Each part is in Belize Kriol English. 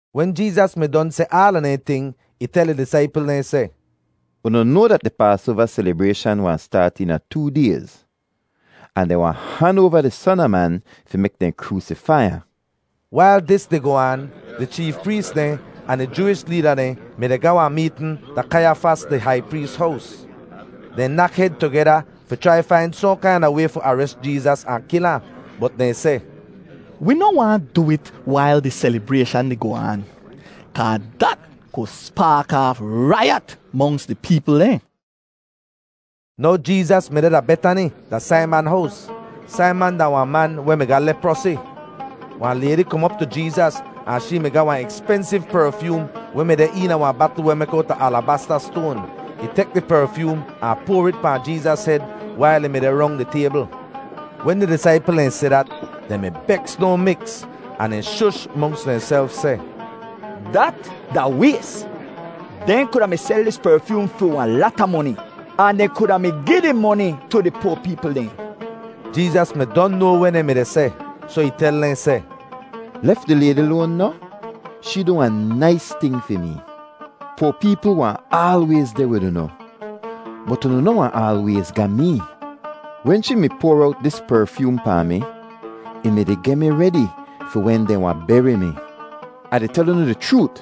Wen Jeezas mi don seh aala dehn ting, ih tel ih disaipl dehn seh, “Unu noa dat di Paasoava selibrayshan wahn staat eena too dayz, ahn dehn wahn han oava di Son a Man fi mek dehn kroosifai ahn.” Wail dis di goh aan, di cheef prees dehn ahn di Jooish leeda dehn mi-di ga wahn meetn da Kaiyafas di hai prees hows. Dehn nak hed tugeda fi chrai fain sohn kaina way fi ares Jeezas ahn kil ahn. Bot dehn seh, “Wi noh waahn du it wail di selibrayshan di goh aan, kaa dat ku spaak aaf raiyat monks di peepl dehn.” Now Jeezas mi deh da Betani da Saiman hows. Saiman da wahn man weh mi ga leprosi. Wahn laydi kom op tu Jeezas ahn shee mi ga wahn ekspensiv perfyoom weh mi deh eena wahn batl weh mek owta alabasta stoan. Ih tek di perfyoom ahn poar it pahn Jeezas hed wail ih mi deh rong di taybl. Wen di disaipl dehn si dat, dehn mi beks no miks, ahn dehn shush monks dehnself seh, “Dat da ways! Dehn kuda mi sel dis perfyoom fi wahn lata moni, ahn dehn kuda mi gi di moni tu di poa peepl dehn.” Jeezas mi don noa weh dehn mi-di seh, soh ih tel dehn seh, “Lef di laydi loan noh? Shee du wahn nais ting fi mi. Poa peepl wahn aalwayz deh wid unu, bot unu noh wahn aalwayz ga mee. Wen shee mi poar owt dis perfyoom pahn mi, ih mi-di geh mi redi fi wen dehn wahn beri mi. Ah di tel unu di chroot,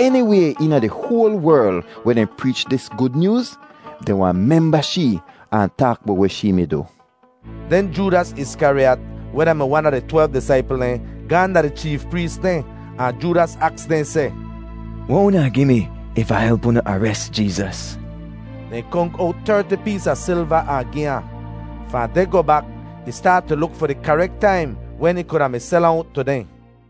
eniway eena di hoal werl weh dehn preech dis Gud Nyooz, dehn wahn memba shee ahn taak bowt weh shee mi du.” Den Joodas Iskariyat, weh da-mi wan a di twelv disaipl dehn, gaahn da di cheef prees dehn. Ahn Joodas aks dehn seh, “Weh unu wahn gi mi if Ah help unu ares Jeezas?” Dehn konk owt terti pees a silva ahn gi ahn. Fahn deh goh bak ih staat tu luk fi di karek taim wen ih kuda mi sel ahn owt tu dehn.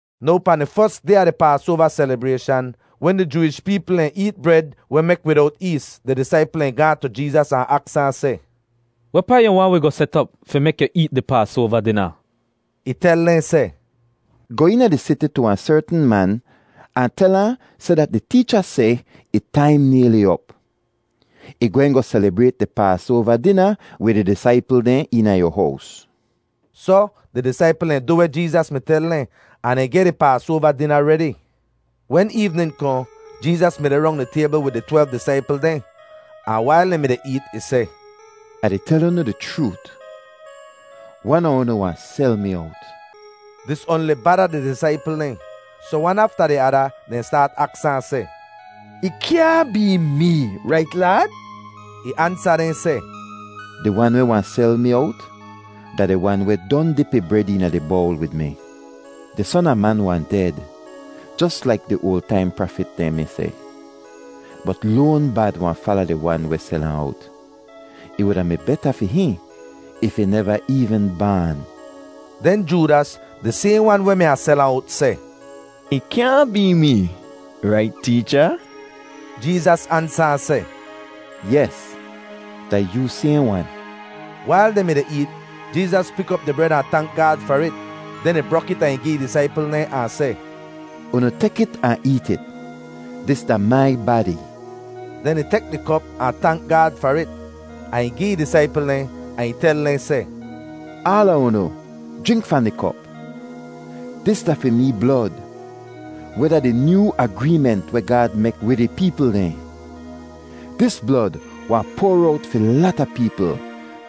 Now pahn di fos day a di Paasoava selibrayshan wen di Jooish peepl dehn eet bred weh mek widowt ees, di disaipl dehn gaahn tu Jeezas ahn aks ahn seh, “Wehpaa yu waahn wi goh set op fi mek yu eet di Paasoava dina?” Ih tel dehn seh, “Goh eena di siti tu wahn sertn man ahn tel ahn seh dat di teecha seh ih taim nayli op. Ih gwehn goh selibrayt di Paasoava dina wid ih disaipl dehn eena yu hows.” Soh, di disaipl dehn du weh Jeezas mi tel dehn, ahn dehn geh di Paasoava dina redi. Wen eevnin kohn Jeezas mi deh rong di taybl wid di twelv disaipl dehn. Ahn wail dehn mi-di eet, ih seh, “Ah di tel unu di chroot, wan a unu wahn sel mi owt.” Dis oanli bada di disaipl dehn. Soh wan afta di ada dehn staat aks ahn seh, “Ih kyaahn bee mee, rait Laad?” Ih ansa dehn seh, “Di wan weh wahn sel mi owt da di wan weh don dip ih bred eena di bowl wid mi. Di Son a Man wahn ded jos laik di oal taim prafit dehn mi seh, bot loan bad wahn fala di wan weh sel ahn owt. Ih wuda mi beta fi hihn if ih neva eevn baan!” Den Joodas, di sayhn wan weh mi wahn sel ahn owt, seh, “Ih kyaahn bee mee, rait Teecha?” Jeezas ansa ahn seh, “Yes, da yoo sayhn wan.” Wail dehn mi-di eet, Jeezas pik op di bred ahn tank Gaad far it. Den ih brok it ahn gi ih disaipl dehn ahn seh, “Unu tek it ahn eet it. Dis da mai badi.” Den ih tek di kop ahn tank Gaad far it; ahn ih gi ih disaipl dehn ahn ih tel dehn seh, “Aala unu jrink fahn di kop. Dis da fi mee blod, weh da di nyoo agreement weh Gaad mek wid ih peepl dehn. Dis blod wahn poar owt fi lata peepl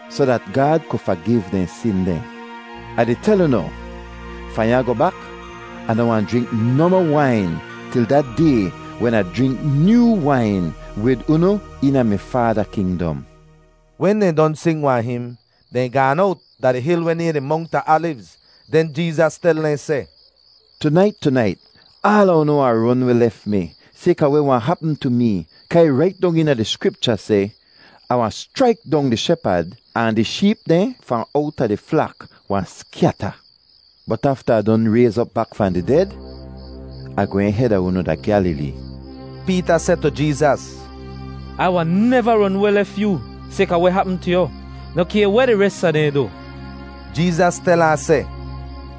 soh dat Gaad ku fagiv dehn sin dehn. “Ah di tel unu, fahn ya goh bak Ah noh wahn jrink nohmoh wain til da day wen Ah jrink nyoo wain wid unu eena mi Faada kingdom.” Wen dehn don sing wahn him, dehn gaan owt da di hil weh nayhn di Mongt a Alivz. Den Jeezas tel dehn seh, “Tunait, tunait aala unu wahn ron weh lef mi, sayka weh wahn hapm tu mee kaa ih rait dong eena di Skripcha seh, ‘Ah wahn schraik dong di shepad, ahn di sheep dehn fahn owta di flak wahn skyata.’ Bot afta Ah don rayz op bak fahn di ded, Ah gwehn heda unu da Gyalilee.” Peeta seh tu Jeezas, “Ai wahn neva ron weh lef yoo sayka weh hapm tu yu, noh kay weh di res a dehn du.” Jeezas tel ahn seh,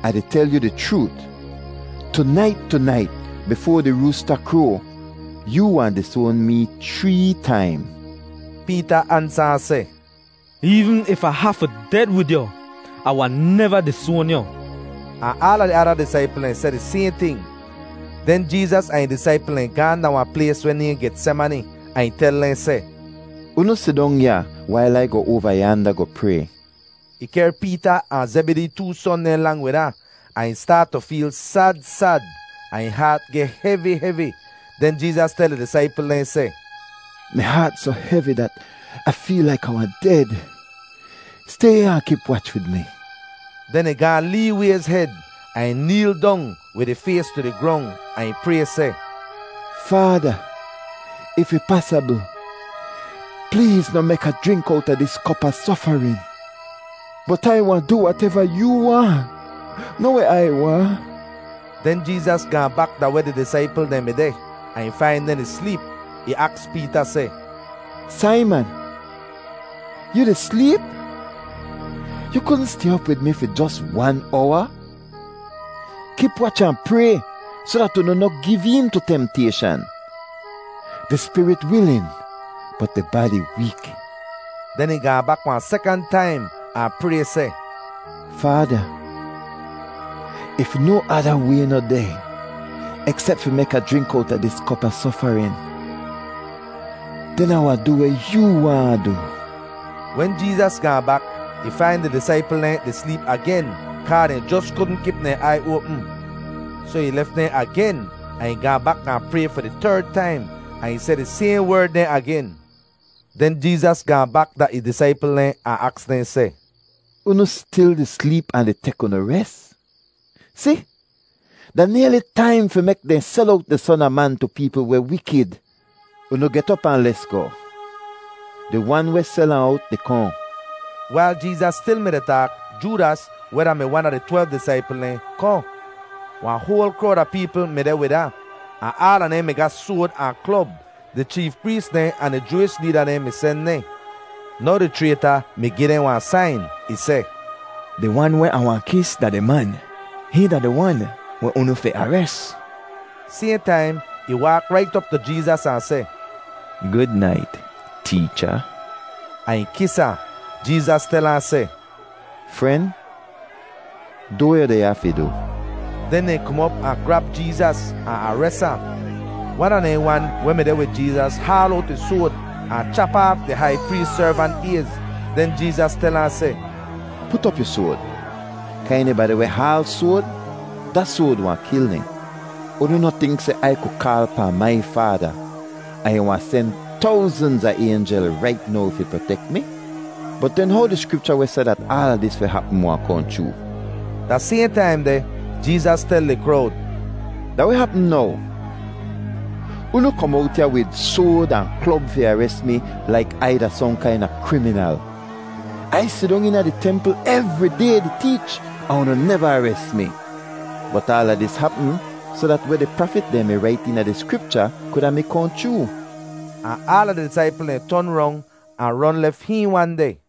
“Ah di tel yu di chroot, tunait tunait bifoa di roosta kroa, yoo wahn disoan mee chree taim.” Peeta ansa ahn seh, “Eevn if Ah hafu ded wid yu, Ah wahn neva disoan yu.” Ahn aala di ada disaipl dehn seh di sayhn ting. Den Jeezas ahn ih disaipl dehn gaahn da wahn plays weh nayhn Getsemani, ahn ih tel dehn seh, “Unu sidong ya wail Ai goh oava yaanda goh pray.” Ih kehr Peeta ahn Zebidee too son dehn lang wid ahn, ahn ih staat tu feel sad sad ahn ih haat geh hevi hevi. Den Jeezas tel di disaipl dehn seh, “Mi haat soh hevi dat Ah feel laik Ah wahn ded. Stay ya ahn kip wach wid mi.” Den ih gaahn lee wayz hed ahn ih neel dong wid ih fays tu di grong ahn ih pray seh, “Faada, if ih pasabl, pleez noh mek Ah jrink owta dis kop a sofarin. Bot Ai wahn du wateva yoo waahn, noh weh Ai waahn.” Den Jeezas gaahn bak da weh di disaipl dehn mi deh ahn ih fain dehn di sleep. Ih aks Peeta seh, “Saiman, yu di sleep? Yu kudn stay op wid mi fi jos wan owa? Kip wach ahn pray soh dat unu noh giv een tu temtayshan. Di spirit wilin bot di badi week.” Den ih gaahn bak wahn sekant taim ahn pray seh, “Faada, if no ada way noh deh eksep fi mek Ah jrink owta dis kop a sofarin, den Ah wahn du weh yoo waahn Ah du.” Wen Jeezas gaahn bak, ih fain di disaipl dehn di sleep agen kaa dehn jos kudn kip dehn aiy oapm. Soh ih lef dehn agen ahn ih gaahn bak gaahn pray fi di terd taim, ahn ih seh di sayhn werd dehn agen. Den Jeezas gaahn bak da ih disaipl dehn ahn aks dehn seh, “Unu stil di sleep ahn di tek unu res? Si, da nayli taim fi mek dehn sel owt di Son a Man tu peepl weh wikid. Unu get op ahn lesgoh! Di wan weh sel ahn owt di kohn.” Wail Jeezas stil mi-di taak, Joodas, weh da-mi wan a di twelv disaipl dehn, kohn. Wahn hoal krowd a peepl mi deh wid ahn, ahn aala dehn mi ga soad ahn klob. Di cheef prees dehn ahn di Jooish leeda dehn mi sen dehn. Now di chrayta mi gi dehn wahn sain. Ih seh, “Di wan weh Ah wahn kis da di man. Hihn da di Wan weh unu fi ares.” Sayhn taim ih waak rait op tu Jeezas ahn seh, “Gud nait, Teecha!” ahn ih kis ahn. Jeezas tel ahn seh, “Fren, du weh yu deh ya fi du.” Den dehn kom op ahn grab Jeezas ahn ares ahn. Wan a dehn wan weh mi deh wid Jeezas haal owt ih soad ahn chap aaf di hai prees servant ayz. Den Jeezas tel ahn seh, “Put op yu soad, kaa enibadi weh haal soad, da soad wahn kil dehn. Unu noh tink seh Ai ku kaal pahn mai Faada, ahn ih wahn sen towznz a aynjel rait now fi protek mi? Bot den how di Skripcha weh seh dat aala dis fi hapm wahn kohn chroo?” Da sayhn taim deh, Jeezas tel di krowd, “Da weh hapm now? Unu kom owt ya wid soad ahn klob fi ares mi laik Ai da sohn kaina kriminal. Ai sidong eena di templ evri day di teech ahn unu neva ares mi. Bot aala dis hapm soh dat weh di prafit dehn mi rait eena di Skripcha kuda mi kohn chroo.” Ahn aala di disaipl dehn ton rong ahn ron lef hihn wan deh.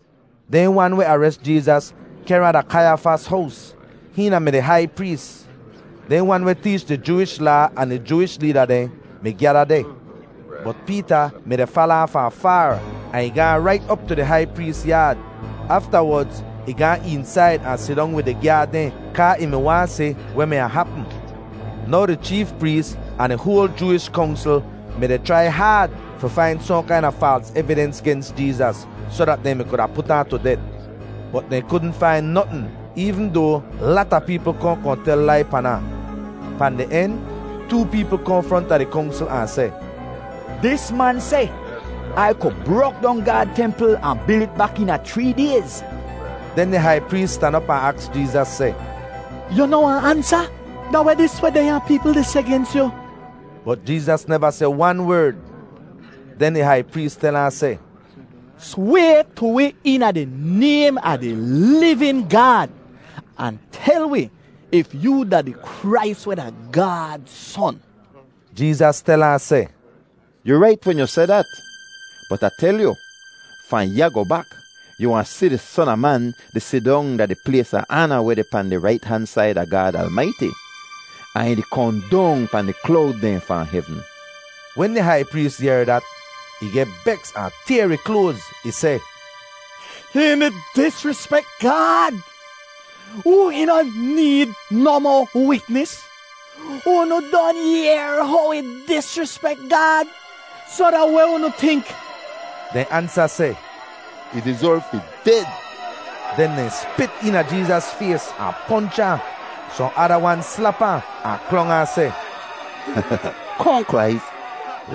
Dehn wan weh ares Jeezas kehr ahn da Kaiyafas hows. Hihn da-mi di hai prees. Dehn wan weh teech di Jooish Laa ahn di Jooish leeda dehn mi gyada deh. Bot Peeta mi-di fala ahn fahn faar, ahn ih gaahn rait op tu di hai prees yaad. Aftawodz ih gaan eensaid ahn sidong wid di gyaad dehn kaa ih mi waahn si weh mi wahn hapm. Now di cheef prees ahn di hoal Jooish Kongsl mi-di chrai haad fi fain sohn kaina faals evidens gens Jeezas, soh dat dehn kuda mi put ahn tu det. Bot dehn kudn fain notn, eevn doa lata peepl kohn kohn tel lai pan ahn. Pahn di en, too peepl kohn fronta di Kongsl ahn seh, “Dis man seh, ‘Ai ku brok dong Gaad templ ahn bil it bak eena chree dayz.’” Den di hai prees stan op ahn aks Jeezas seh, “Yu noh wahn ansa? Da weh dis weh dehnya peepl di seh gens yu?” Bot Jeezas neva seh wan werd. Den di hai prees tel ahn seh, “Sway tu wi eena di naym a di livin Gaad, ahn tel wi if yoo da di Krais weh da Gaad Son.” Jeezas tel ahn seh, “Yu rait wen yu seh dat. Bot Ah tel yu, fahn ya goh bak, yu wahn si di Son a Man di sidong da di plays a aana weh deh pahn di rait han said a Gaad Almaiti, ahn ih di kohn dong pahn di klowd dehn fahn hevn.” Wen di hai prees yehr dat, ih geh beks ahn tayr ih kloaz. Ih seh, “Hihn di disrispek Gaad! Wi noh need nohmoh witnis. Unu don yehr how ih disrispek Gaad. Soh da weh unu tink?” Dehn ansa seh, “Ih dizerv fi ded.” Den dehn spit eena Jeezas fays ahn ponch ahn. Sohn ada wan slap ahn, ahn klong ahn seh, “Kohn Krais,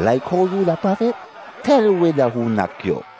laik how yu da prafit, tel wi da hoo nak yu.”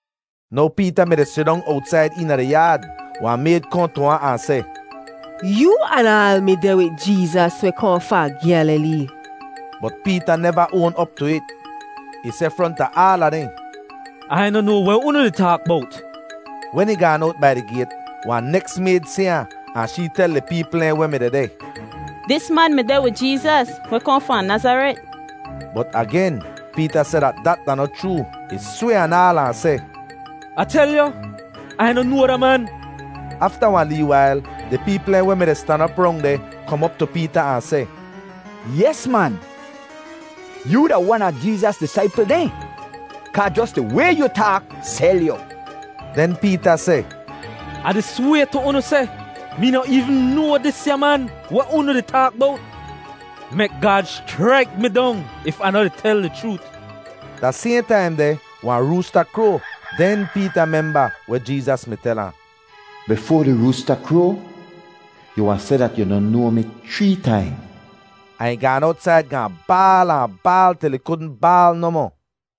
Now Peeta mi-di sidong owtsaid eena di yaad. Wahn mayd kohn tu ahn, ahn seh, “Yoo anaal mi deh wid Jeezas weh kohn fahn Gyalilee.” Bot Peeta neva oan op tu it. Ih seh fronta aala dehn, “Ai noh noa weh unu di taak bowt.” Wen ih gaan owt bai di gayt, wahn neks mayd si ahn, ahn shee tel di peepl dehn weh mi dehdeh, “Dis man mi deh wid Jeezas weh kohn fahn Nazaret.” Bot agen Peeta seh dat dat da noh chroo. Ih sway anaal ahn seh, “Ah tel yu, Ai noh noa da man!” Afta wahn lee wail, di peepl dehn weh mi-di stan op rong deh kom op tu Peeta ahn seh, “Yes, man! Yoo da wan a Jeezas disaipl dehn, kaa jos di way yu taak sel yu.” Den Peeta seh, “Ah di sway tu unu seh mee noh eevn noa disya man weh unu di taak bowt! Mek Gaad schraik mi dong if Ah noh di tel di chroot.” Da sayhn taim deh wahn roosta kroa. Den Peeta memba weh Jeezas mi tel ahn: “Bifoa di roosta kroa, yu wahn seh dat yu noh noa mi chree taim.” Ahn ih gaan owtsaid gaahn baal ahn baal til ih kudn baal nohmoh.